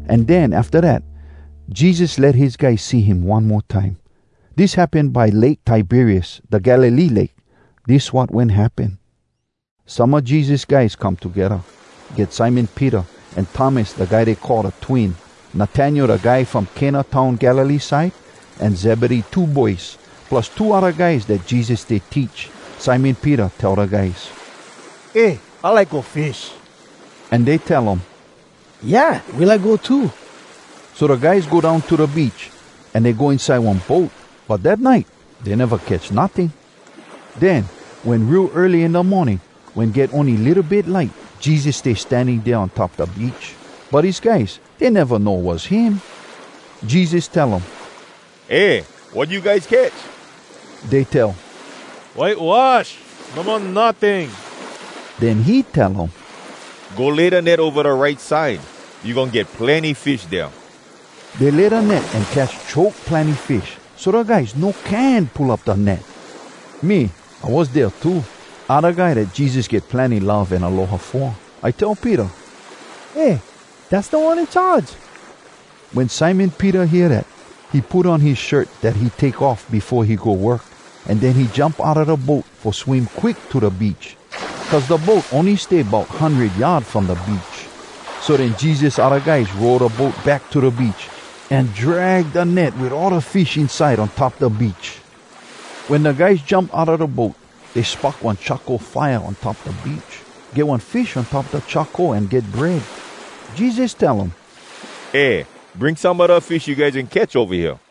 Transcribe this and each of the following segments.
An den, afta dat, Jesus let his guys see him one mo time. Dis happen by Lake Tiberias, da Galilee Lake. Dis wat wen happen: Some a Jesus guys come togedda. Get Simon Peter, an Thomas da guy dey call Da Twin, Natanael da guy from Cana town Galilee side, an Zebedee two boys, plus two odda guys dat Jesus stay teach. Simon Peter tell da guys, “Eh, I like go fish!” An dey tell um, “Yeah! We like go too.” So da guys go down to da beach, an dey go inside one boat. But dat nite, dey neva catch notting. Den wen real early in da morning wen get ony litto bit light, Jesus stay standing dea on top da beach. But his guys, dey neva know was him. Jesus tell um, “Eh! Wat you guys catch?” Dey tell, “Whitewash! No mo notting!” Den he tell um, “Go lay da net ova da right side! You goin get plenny fish dea!” Dey lay da net, an catch choke plenny fish, so da guys no can pull up da net. Me, I was dea too. I da guy dat Jesus get plenny love an aloha fo. I tell Peter, “Eh! Dass Da One In Charge!” Wen Simon Peter hear dat, he put on his shirt dat he take off befo he go work, an den he jump outa da boat fo swim quick to da beach, cuz da boat ony stay bout hundred yard from da beach. So den Jesus odda guys row da boat back to da beach, an drag da net wit all da fish inside on top da beach. Wen da guys jump outa da boat, dey spock one charcoal fire on top da beach. Get one fish on top da charcoal an get bread. Jesus tell um, “Eh, bring some a da fish you guys wen catch ova hea.”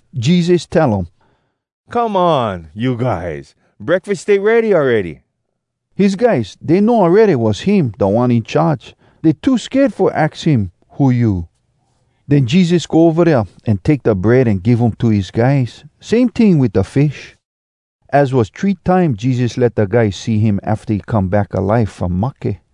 Jesus tell um, “Come on, you guys! Breakfas stay ready awready!” His guys, dey know awready was him, Da One In Charge. Dey too sked fo aks him, “Who you?” Den Jesus go ova dea, an take da bread an give um to his guys. Same ting wit da fish. Az was three time Jesus let da guys see him afta he come back alive from mahke.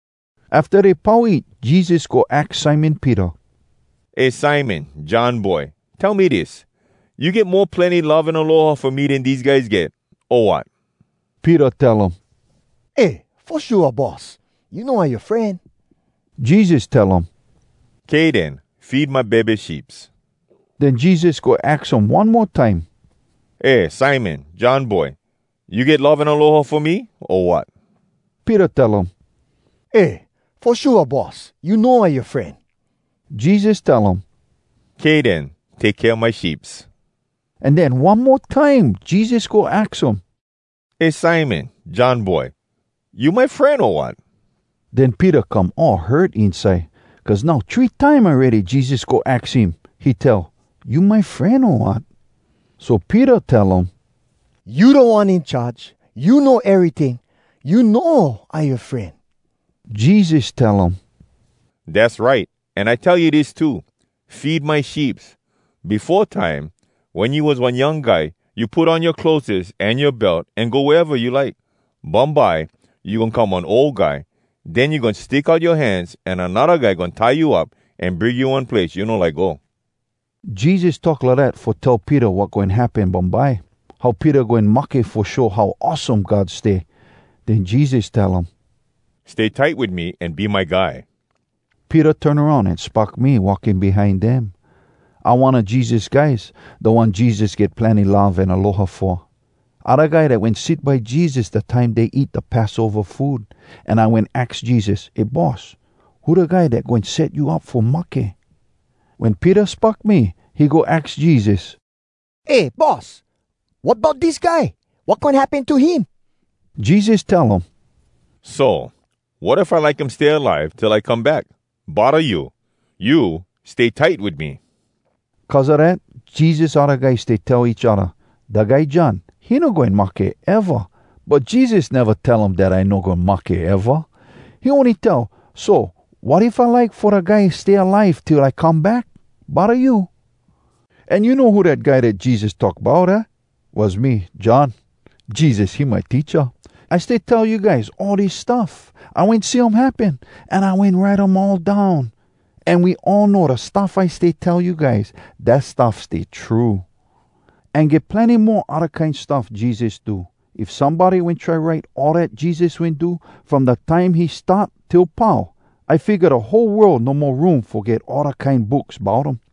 Afta dey pau eat, Jesus go aks Simon Peter, “Eh Simon, John boy. Tell me dis: You get mo plenny love an aloha fo me den dese guys get, o wat?” Peter tell um, “Eh, fo shua, Boss. You know I yoa fren.” Jesus tell um, “Kay den. Feed my bebe sheeps.” Den Jesus go aks um one mo time, “Eh Simon, John boy. You get love an aloha fo me, o wat?” Peter tell um, “Eh, fo shua, Boss! You know I yoa fren.” Jesus tell um, “Kay den. Take kea my sheeps.” An den one mo time, Jesus go aks um, “Eh Simon, John boy. You my fren, o wat?” Den Peter come all hurt inside, cuz now three time awready Jesus go aks him. He tell, “You my fren, o wat?” So Peter tell um, “You Da One In Charge! You know eryting! You know I yoa fren.” Jesus tell um “Dass right! An I tell you dis too: Feed my sheeps. Befo time, wen you was one young guy, you put on yoa clotheses an yoa belt an go wea eva you like. Bumbye, you goin come one ol guy. Den you goin stick out yoa hands an anodda guy goin tie you up an bring you one place you no like go.” (Jesus talk lidat fo tell Peter wat goin happen bumbye, how Peter goin mahke fo show how awesome God stay.) Den Jesus tell um, “Stay tight wit me an be my guy.” Peter turn aroun, an spock me walking behind dem. I one a Jesus guys, da one Jesus get plenny love an aloha fo. I da guy dat wen sit by Jesus da time dey eat da Passova food, an I wen aks Jesus, “Eh Boss, who da guy dat goin set you up fo mahke?” Wen Peter spock me, he go aks Jesus, “Eh Boss! Wat bout dis guy? Wat goin happen to him?” Jesus tell um, “So, wat if I like him stay alive till I come back? Bodda you? You, stay tight wit me!” Cuz a dat, Jesus odda guys stay tell each odda, “Dat guy John, he no goin mahke, eva.” But Jesus neva tell um dat I no goin mahke, eva. He ony tell, “So, wat if I like fo da guy stay alive till I come back? Bodda you?” An you know who dat guy dat Jesus talk bout, aah? Was me, John! Jesus, he my teacha. I stay tell you guys all dis stuff. I wen see um happen, an I wen write um all down. An we all know da stuff I stay tell you guys, dat stuff stay true. An get plenny mo odda kine stuff Jesus do. If somebody wen try write all dat Jesus wen do, from da time he start till pau, I figga da whole world no mo room fo get all da kine books bout um.